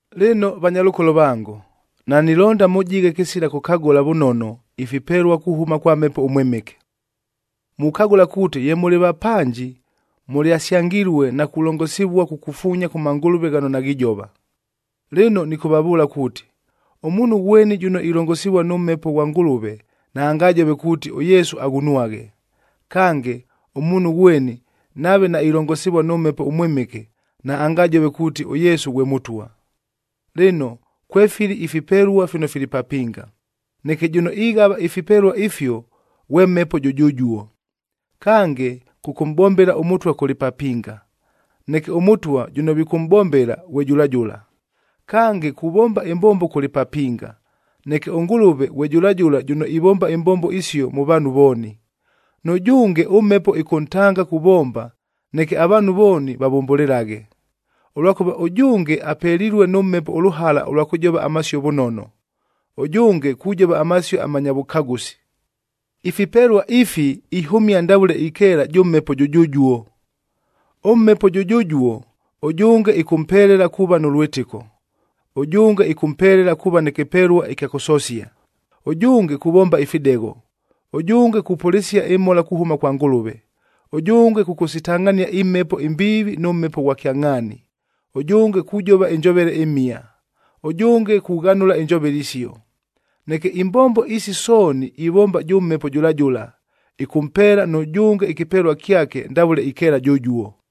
Lɨno vanyalʉkolo vango, nanilonda mʉjighe kɨsila kʉkagʉla vʉnono ifipelua kuhʉma kwa Mhepo ʉMwɨmɨke. Mukagʉla kuuti ye mʉlɨ vapanji, mʉlyasyangilue na kulongosivua kukufuunya kʉ mangʉlʉve ghano naghijova. Lɨno nɨkʉvavʉʉla kuuti, ʉmuunhu ghweni jʉno ilongosivua nʉ Mhepo ghwa Ngʉlʉve naangajove kuuti, “ɄYesu aghunwaghe.” Kange, ʉmuunhu ghweni nave nailongosivua nʉ Mhepo ʉMwɨmɨke naangajove kuuti, “ɄYesu ghwe Mʉtwa.” Lɨno, kwefili ifipelua fino fili papinga, neke jʉno ighava ifipelua ifio ghwe Mhepo jʉjʉjuo. Kange, kʉkʉmʼbombela ʉMʉtwa kʉlɨ papinga, neke ʉMʉtwa jʉno vikʉmʼbombela ghwe jʉla jʉla. Kange, kuvomba ɨmbombo kʉlɨ papinga, neke ʉNgʉlʉve ghwe jʉla jʉla jʉno ivomba imbombo isio mʉ vaanhu vooni. Nʉjʉnge ʉMhepo ɨkʉntanga kuvomba, neke avaanhu vooni vavʉmbʉlɨlaghe. Ʉlwakʉva ʉjʉnge apelilue nʉ Mhepo ʉlʉhala ʉlwa kʉjova amasio vʉnono, ʉjʉnge kujova amasio amanya vʉkagʉsi. Ifipelua ifi ihʉmia ndavʉle ikeela jʉ Mhepo jʉjʉjuo. ɄMhepo jʉjʉjuo, ʉjʉnge ɨkʉmpelela kuuva nʉ lwɨtɨko, ʉjʉnge ɨkʉmpelela kuuva nɨ kɨpelua ɨkya kʉsosia, ʉjʉnge kuvomba ifidegho, ʉjʉnge kupʉlɨsia ɨmhola kuhʉma kwa Ngʉlʉve, ʉjʉnge kʉkʉsitangʼhania imhepo imbiivi nʉ Mhepo ghwa kyangʼhaani, ʉjʉnge kujova ɨnjovele ɨmhia, ʉjʉnge kughanʉla injovele isio. Neke imbombo isi sooni ivomba jʉ Mhepo jʉla jʉla, ɨkʉmpeela nʉjʉnge ɨkɨpelua kyake ndavʉle ikeela jʉjuo.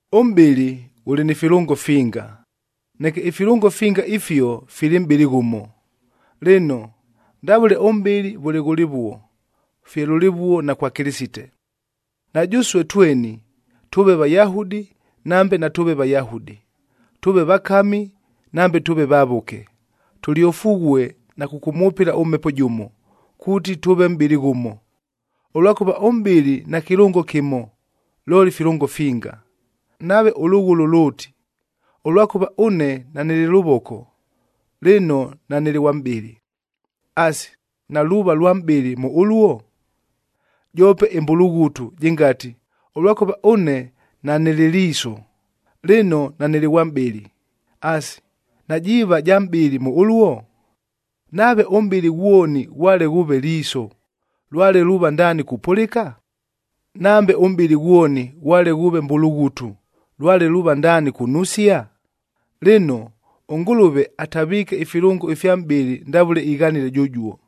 Ʉmʼbɨlɨ ghʉlɨ ni filʉngo finga, neke ifilʉngo finga ifio fili mʼbɨlɨ ghʉmo. Lɨno, ndavʉle ʉmʼbɨlɨ vʉle ghʉlɨvuo, fye lʉlɨvuo na kwa Kɨlɨsite. Na jʉsue tweni, tʉʉve Vayahudi nambe natʉʉve Vayahudi, tʉʉve vakami nambe tʉʉve vavʉke, tʉlyofughue na kʉkʉmwʉpɨla ʉMhepo jʉmo, kuuti tʉʉve mʼbɨlɨ ghʉmo. Ʉlwakʉva ʉmʼbɨlɨ nakɨlʉngo kɨmo, looli filʉngo finga. Nave ʉlʉghʉlʉ lʉʉti, “Ʉlwakʉva ʉne nanɨlɨ lʉvoko, lɨno nanɨlɨ ghwa mʼbɨlɨ,” asi, naluuva lwa mʼbɨlɨ mʉ ʉluo? Joope ɨmbulughutu jɨngati, “Ʉlwakʉva ʉne nanɨlɨ liiso, lɨno nanɨlɨ ghwa mʼbɨlɨ,” asi, najiiva ja mʼbɨlɨ mʉ ʉluo? Nave ʉmʼbɨlɨ ghwoni ghwale ghʉʉve liiso, lwale luuva ndaani kupʉlɨka? Nambe ʉmʼbɨlɨ ghwoni ghwale ghʉʉve mbulughutu, lwale luuva ndaani kunusia? Lɨno, ʉNgʉlʉve ataviike ifilʉngo ifya mʼbɨlɨ ndavʉle ighanile jʉjuo.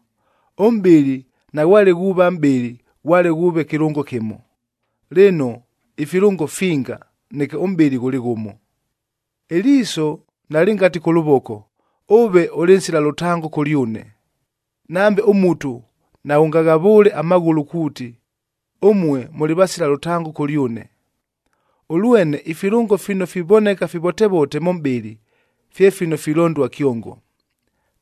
Ʉmʼbɨlɨ naghwale ghuuva mʼbɨlɨ, ghwale ghʉʉve kɨlʉngo kɨmo. Lɨno, ifilʉngo finga, neke ʉmʼbɨlɨ ghʉlɨ ghʉmo. Ɨliiso nalɨngati kʉ lʉvoko, “Ʉve ʉlɨ nsila lʉtango kʉlyʉne.” Nambe ʉmutu naghʉngaghavʉʉle amaghʉlʉ kuuti, “Ʉmue mʉlɨ vasila lʉtango kʉlyʉne.” Ʉlwene ifilʉngo fino fivoneka fivotevote mʉ mʼbɨlɨ, fye fino filondua kyongo.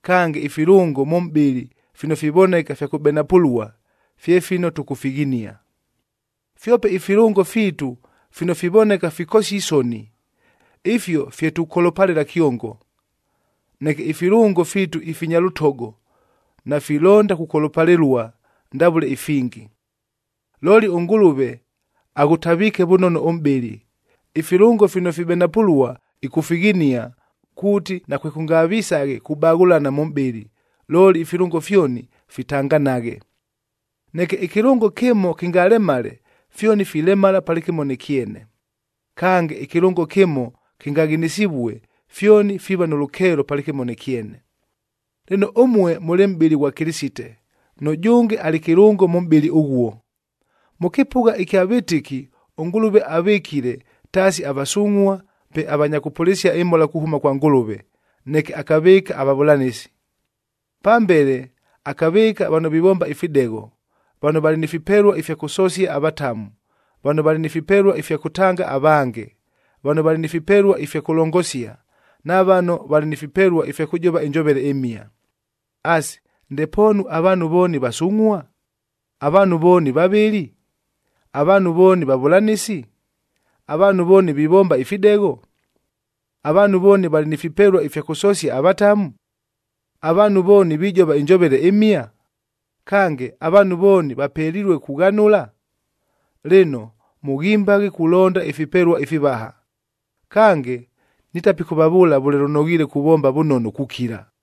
Kange, ifilʉngo mʉ mʼbɨlɨ fino fivoneka fya kʉbenapʉlua, fye fino tʉkʉfighinia. Fyope ifilʉngo fiitu fino fivoneka fikosia isoni, ifio fye tukolopalɨla kyongo, neke ifilʉngo fiitu ifinya lʉtogo, nafilonda kukolopalɨlua ndavʉle ifingi. Looli ʉNgʉlʉve aghʉtaviike vʉnono ʉmʼbɨlɨ, ifilʉngo fino fibenapʉlua ɨkʉfighinia, kuuti nakwekʉngavisaghe kubaghʉlana mʉ mʼbɨlɨ, looli ifilʉngo fyoni fitanganaghe. Neke ɨkɨlʉngo kɨmo kɨngalemale, fyoni filemala palɨkɨmo nɨ kyene. Kange, ɨkɨlʉngo kɨmo kɨngaghinisivue, fyoni fiiva nʉ lʉkeelo palɨkɨmo nɨ kyene. Lɨno, ʉmue mʉlɨ mʼbɨlɨ ghwa Kɨlɨsite, nʉjʉnge alɨ kɨlʉngo mʉ mʼbɨlɨ ʉghuo. Mʉ kɨpʉgha ɨkya vɨtɨki, ʉNgʉlʉve avɨkile, taasi avasungʼhua, pe avanya kʉpʉlɨsia ɨmhola kuhʉma kwa Ngʉlʉve, neke akavɨɨka avavʉlanɨsi. Pambele akavɨɨka vano vivomba ifidegho, vano valɨ ni fipelua ifya kʉsosia avatamu, vano valɨ ni fipelua ifya kʉtanga avange, vano valɨ ni fipelua ifya kʉlongosia, na vano valɨ ni fipelua ifya kʉjova ɨnjovele ɨmhia. Asi, ndepoonu avaanhu vooni vasungʼhua? Avaanhu vooni vavɨli? Avaanhu vooni vavʉlanɨsi? Avaanhu vooni vivomba ifidegho? Avaanhu vooni valɨ ni fipelua ifya kʉsosia avatamu? Avaanhu vooni vijova ɨnjovele ɨmhia? Kange, avaanhu vooni vapelilue kughanʉla? Lɨno, mʉghimbaghe kulonda ifipelua ifivaha. Kange, nitapikʉvavʉʉla vʉle lʉnoghiile kuvomba vʉnono kukila.